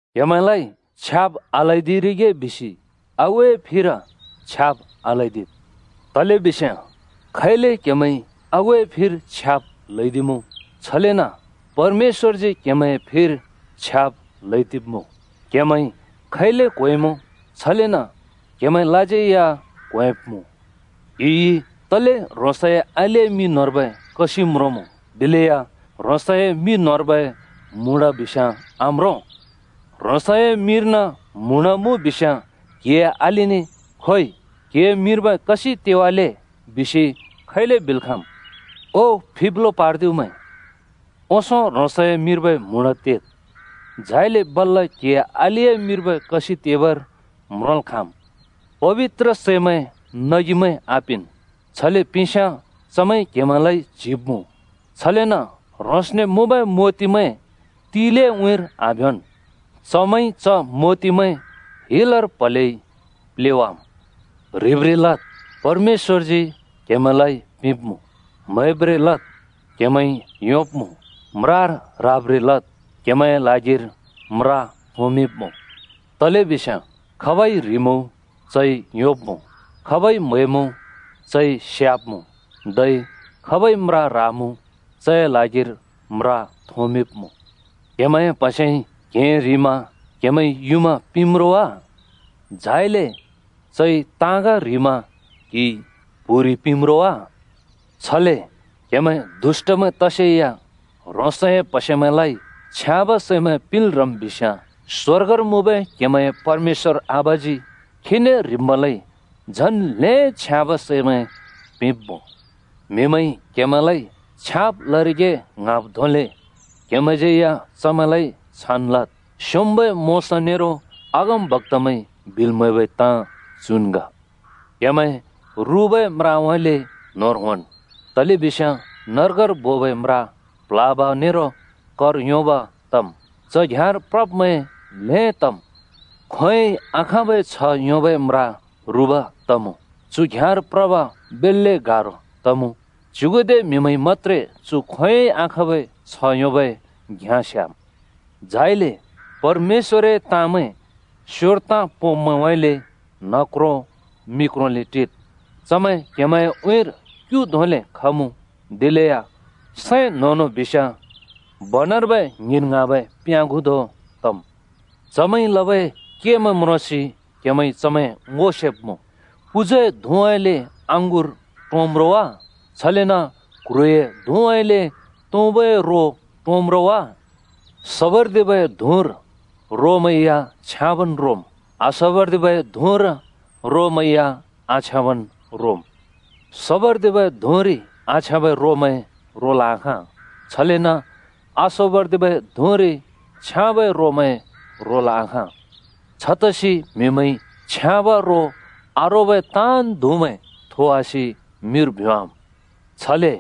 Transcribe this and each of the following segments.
“क्‍हेमैंलाइ छ्याब् आल्‍हैदिरिगे बिसि आगुए फिर छ्याब् आल्हैदिद्। तलेबिस्याँ खैले क्हेमैंइ आगुए फिर छ्याब् ल्‍हैदिमुँ। छलेन परमेश्‍वरजी क्‍हेमैंए फिर छ्याब् ल्‍हैदिब्मुँ। क्‍हेमैंइ खैले क्होंएँमुँ, छलेन क्‍हेमैंलाज्यै या क्‍होंएँब्‍मुँ। “क्‍हिइ तले ह्रोंसए अलिए मि न्होंर्बै कसिं म्रोंमुँ दिलेया ह्रोंसए मि न्होंर्बै म्हुँडा आम्रों? ह्रोंसए मिर्न म्हुँडा मुँ बिस्याँ क्‍हिए अलिने ‘खोइ, क्‍हिए मिर्बै कसिं तेवाले,’ बिसि खैले बिल् खाँमुँ। ओ फिब्लो पार्दिब्मैं, ओंसों ह्रोंसए मिर्बै म्हुँडा तेद्, झाइले बल्‍ल क्‍हिए अलिए मिर्बै कसिं तेबर म्रोंल् खाँम्। “पबित्र सैमैं नगिमैं आपिंन्। छले पिंस्‍याँ चमैंइ क्‍हेमैंलाइ च्‍हिवाब्मुँ। छलेन ह्रोंसने मुँबै मोतिमैं तिलिए उँइँर आभ्योंन्, चमैंइ च मोतिमैं हिलर प्‍हलेइ प्‍लेवाम्। “ह्रिब्रें लद् परमेश्‍वरजी क्‍हेमैंलाइ पिंब्मुँ। म्हैब्रें लद् क्‍हेमैंइ योंब्मुँ। म्रार ह्राब्रें लद् क्हेमैंए ल्हागिरि म्रा थोंमिंब्मुँ। तलेबिस्याँ खाबइ ह्रिमुँ चइ योंब्मुँ, खाबइ म्हैमुँ चइ स्याब्मुँ, धै खाबइ म्रा ह्रामुँ चए ल्हागिरि म्रा थोंमिंब्मुँ। क्हेमैंए प्हसेइ क्हें ह्रिमा क्हेमैंइ युँमा पिंम् रो वा? झाइले चइ ताँग ह्रिमा क्हिइ प्हुरि पिंम् रो वा? छले क्हेमैं दुष्‍टमैं तसेया ह्रोंसए प्हसेमैंलाइ छ्याँब सैमैं पिंल् ह्रम् बिस्याँ, स्वर्गर मुँबै क्हेमैंए परमेश्‍वर आबाजी खीने ह्रिब्मैंलाइ झन् ल्हें छ्याँबै सैमैं पिंब्मुँ। “म्‍हिमैंइ क्‍हेमैंलाइ छ्याँब् लरिगे ङ्हाँब् धोंले क्‍हेमैंज्‍यै या चमैंलाइ छान् लद्। स्‍योंम्‍बै मोशा नेरो अगमबक्‍तामैंइ बिल् म्हैबै ताँ चुन् ग।” “क्हेमैं रुबै म्राउँइँले न्‍होंर होंन्, तलेबिस्याँ नर्गर बोबै म्रा प्‍ल्‍हाब नेरो कर योंब घ्याँ तमुँ, च घ्‍याँर प्रब्‍मैं ल्‍हें तम्। खोंयोंइ आखाँबै छ्ह योंबै म्रा रुब तमुँ, चु घ्‍याँर प्रब बेल्‍ले गारो तमुँ, च्युगुदे म्हिमैंइ मत्‍त्रे चु खोंयोंइ आखाँबै छ्ह योंबै घ्‍याँ स्‍याम्! “झाइले परमेश्‍वरए ताँमैं स्योर ताँ पोंब्मैंउँइँले न्हक्रों मि क्रोंले टिद्। चमैं क्‍हेमैंए उँइँर क्‍यु धोंले खमुँ, दिलेया सैं न्‍होंनों बिस्‍याँ बनर्बै ङ्हिंन् ङ्हाँबै प्‍याँगु धों तम्। चमैंइ लबै केमैं म्रोंसि क्‍हेमैंइ चमैं ङो सेब्मुँ। पुजुए धुँउँइँले अँगुर टोंम् रो वा? छलेन क्ह्रुए धुँउँइँले तुँबुए रो टोंम् रो वा? सोबर्दिबै धुँरि रोमैं या छ्याँबन् रोमुँ, आसोबर्दिबै धुँरि रोमैं या आछ्याँबन् रोमुँ। सोबर्दिबै धुँरि आछ्याँबै रोमैं रोल् आखाँ। छलेन आसोबर्दिबै धुँरि छ्याँबै रोमैं रोल् आखाँ। छतसि म्हिमैंइ छ्याँब रो आरोबै ताँन् धुँमैं थोवासि मिर भ्योवाम्। छले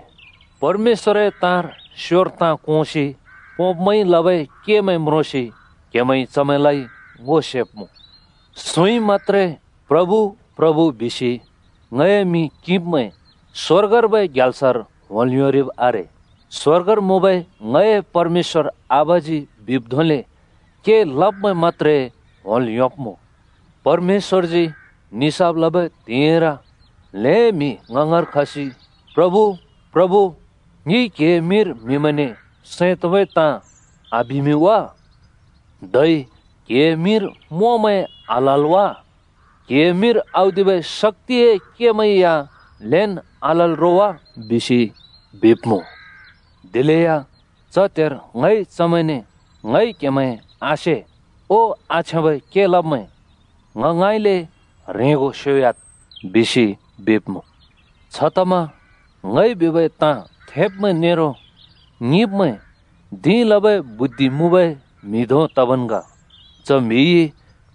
परमेश्‍वरए ताँर स्योर ताँ कोंसि पोंब्मैंइ लबै केमैं म्रोंसि क्‍हेमैंइ चमैंलाइ ङो सेब्मुँ। “सुँइ मत्‍त्रे ङने ‘प्रभु, प्रभु,’ बिसि ङए मिं किंब्‍मैं स्‍वर्गर्बै ग्याल्सर होंल् योंरिब् आरे। स्वर्गर मुँबै ङए परमेश्‍वर आबाजी बिब् धोंले के लब्मैं मत्‍त्रे होंल् योंब्‍मुँ। परमेश्‍वरजी निसाफ लबै त्हिंइर ल्‍हें म्‍हि ङ ङाँर खसि ‘प्रभु, प्रभु! ङिइ क्‍हिए मिंर म्‍हिमैंने सैं तोंबै ताँ आबिमिं वा? धै क्‍हिए मिंर मोंमैं आल्‍हाल् वा, क्हिए मिंर औदिबै शक्‍तिए केमैं या ल्हेंन् आलल् रो वा?’ बिसि बिब्मुँ। ‘दिलेया च त्हेर ङइ चमैंने ङइ क्हेमैं आसे ओ आछ्याँबै के लब्मैं ङ ङाँइँले ह्रेंगो स्‍योह्‍याद्,’ बिसि बिब्मुँ।” “छतमा ङइ बिबै ताँ थेब्मैं नेरो ङिंब्‍मैं धिं लबै बुद्धि मुँबै म्‍हि धों तबन् ग। च म्‍हिइ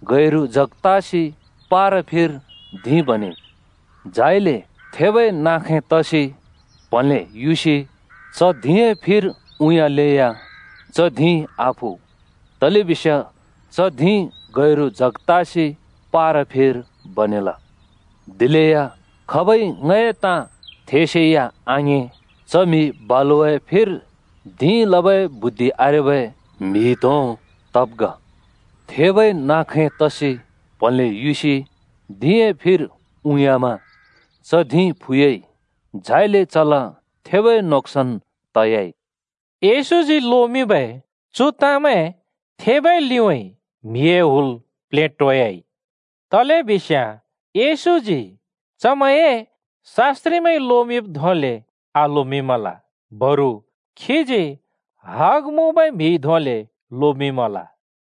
गैरु जग तासि पारा फिर धिं बनेइ। झाइले थेबै नाँ खैं तसि प्हलें युसि च धिंए फिर उँयाँलेया च धिं आफु। तलेबिस्याँ च धिं गैरु जग तासि पारा फिर बनेल। “दिलेया खाबइ ङए ताँ थेसेया आङिं, च म्‍हि बालुवाए फिर धिं लबै बुद्धि आरेबै म्‍हि धों तब् ग। थेबै नाँ खैं तसि प्हलें युसि धिंए फिर उँयामा च धिं फुयाइ झाइले चला थेबै नोक्‍सान त‍याइ।” येशूजी लोमिंबै चु ताँमैं थेबै लिउँइँ म्‍हिए हुल प्लेटोयाइ। तलेबिस्याँ येशूजी चमैंए शास्‍त्रिमैंइ लोब् धोंले आलोमिंल, बरु खीजी हग मुँबै म्हिइ धोंले लोमिंमल।